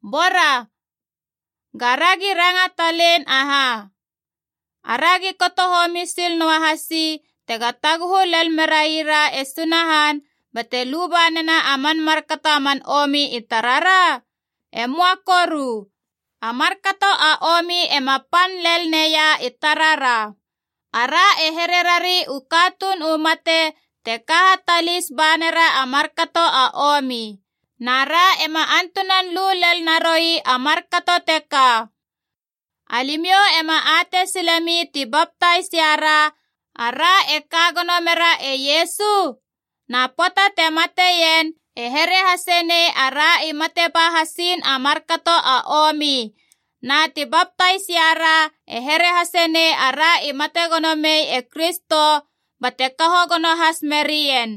Bora, ga ragi ranga talein aha? Aragi kato homi sil noa hasi tega taguhu lel merai ra e Sunahan bate luba nena a man markato a man omi i tarara? E möa koru! A markato a omi ema pan lel neia i tarara. Ara e hererari u katuun u mate te ka hatalis ba nera a markato a omi. Na ra ema antunan lu lelnaroi a markato teka. Alimiou ema atei silemi ti baptais iara, ara e ka gono mera e Iesu? Na pöata te mateien e here hasenei ara i mate ba hasiin a markato a omi, na te baptais ria ra e here hasenei ara i mate gono mei e Kristo bate kaho gono has merien.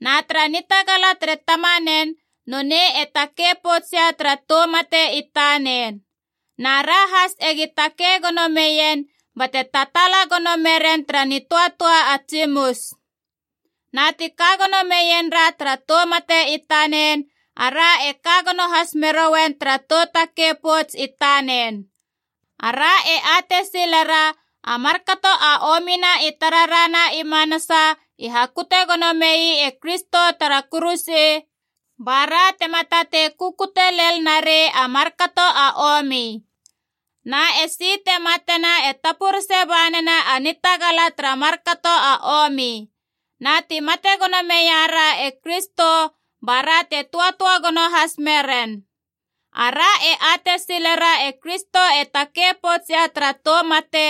Na tara nitagala tere Tamanen nonei e takei pouts ia tara tou mate i tanen. Na ra has egi takei gono meien bate tataala gono meren tara nitöatöa a tsimus. Na ti ka gono meien ra tara tou mate i tanen, ara e ka gono has merouen tara tou takei pouts i tanen. Ara e atei silera a markato a omina i tarara na i manasa i hakute gono mei e Kristo tara kuruse, ba ra tema tatei kukute lel narei a markato a omi. Na esi te matena e tapurese ba nena a nitagala tara markato a omi. Na ti mate gono meia ra e Kristo, ba ra te töatöa gono has meren. Ara e atei silera e Kristo e takei pouts ia tara tou mate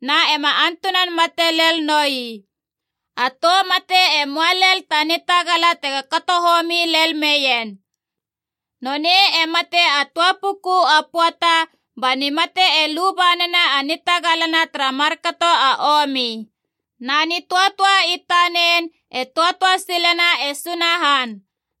na ema antunan mate lel noi. A tou mate e möa lel ta nitagala tego kato homi lel meien. Nonei e mate a töa puku a pöata, ba nimate e luba nena a nitagalana tara markato a omi. Na nitöatöa i tanen e töatöa silena e Sunahan.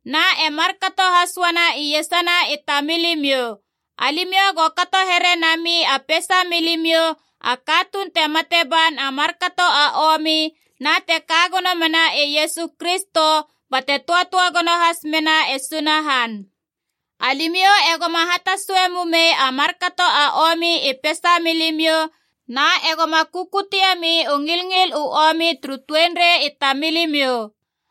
Na e markato has uana iesana i tamilimiou. Alimiou go kato here nami a peisamilimiou a katuun te mate ban a markato a omi na te ka gono mena e Iesu Kristo bate töatöa gono has mena e Sunahan. Alimiou egoma hatasue mumei a markato a omi i peisa milimiou, na egoma kukutiemi u ngilngil u omi turu tuenrei i tamilimiou.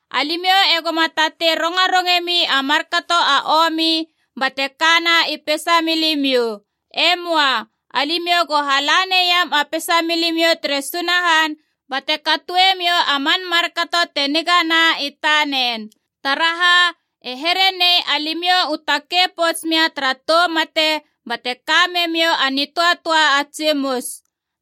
Alimiou egoma tatei rongarongemi a markato a omi bate kana i peisa milimiou. E möa. Alimiou go hala naiam a peisa milimiou tere Sunahan bate katoe miou a man markato te nigana i tanen. Taraha, e here nei alimiou u takei pouts mia tara tou mate bate ka memiou a nitöatöa a tsimus.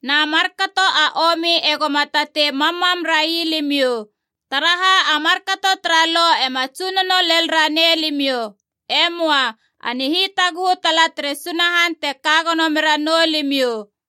Na markato a omi egoma tatei mammam rai limiou. Taraha a markato tara Lo ema tsunono lel ranei limiou. E möa. A nihitaguhu tala tere Sunahan te ka gono meranou limiou.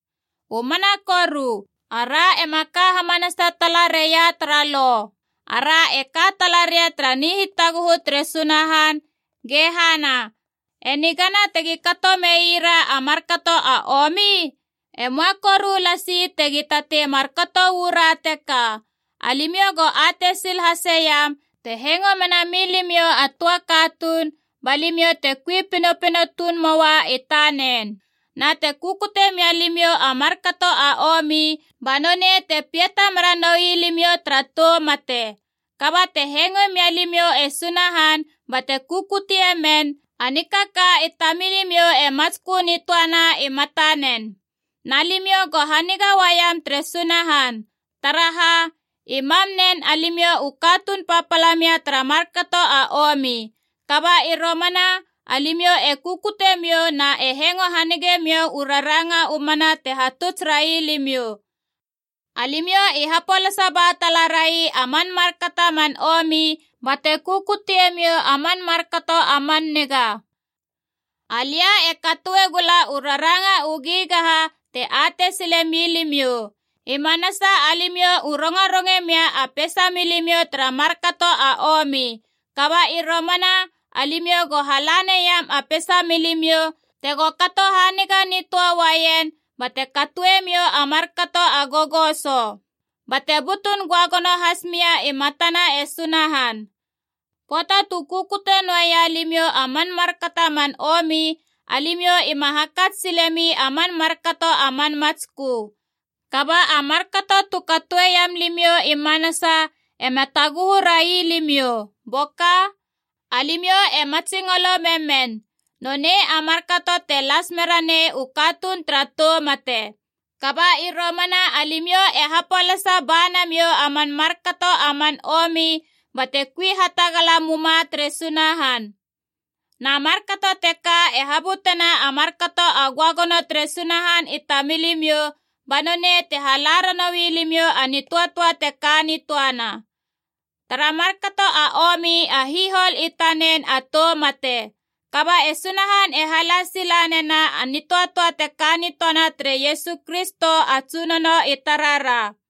U mana koru. Ara ema ka hamanasa talareia tara Lo, ara e ka talaria tara nihitaguhu tere Sunahan, ge hana, e nigana tegi kato meira a markato a omi? E möa koru lasi tegi tatei markato uu ra teka. Alimiou go atei sil haseiam, te hengo mena milimiou a töa katuun, ba limiou te kui pinopino tuun moa i tanen. Na te kukute mia limiou a markato a omi, ba nonei te piata mera noi limiou tara tou mate. Kaba te hengoe mia limiou e Sunahan bate kukuteimen, a nikaka i tamilimiou e matskö nitöana i matanen. Na limiou go haniga uaiam tere Sunahan! Taraha, i mam nen alimiou i katuun papala mia tara markato a omi. Kaba i romana alimiou e kukute miou na e hengo hanige miou u raranga u mana ti hatuts rai limiou. Alimiou i hapolasa ba tala rai a man markato a man omi, bate kukutie miou a man markato a man niga. Alia e katoe gula u raranga u gigaha te atei sile milimiou. I manasa alimiou u rongaronge mia a peisa miou tara markato a omi. Kaba i romana alimiou go hala neiam a peisa milimiou tego kato haniga nitöa uaien bate katoe miou a markato a gogoso. Bate butun göagono has mia i matana e Sunahan. Pöata tu kukute noeia limiou a man markato a man omi, alimiou ima hakats silemi a man markato a man matskö. Kaba a markato tu katoeiam limiou i manasa ema taguhu rai limiou, boka? Alimiou e matsingolo memen. Nonei a markato te las mera nei u katuun tara tou mate. Kaba i romana alimiou e hapolasa ba namiou a man markato a man omi, bate kui hatagala muma tere Sunahan. Na markato teka e habutena a markato a göagono tere Sunahan i tamilimiou, ba nonei te hala ranoui limiou a nitöatöa te ka nitöana. Tara markato a omi a hihol i tanen a tou mate. Kaba e Sunahan e hala sila nena a nitöatöa te ka nitöana tere Iesu Kristo a Tsunono i tarara.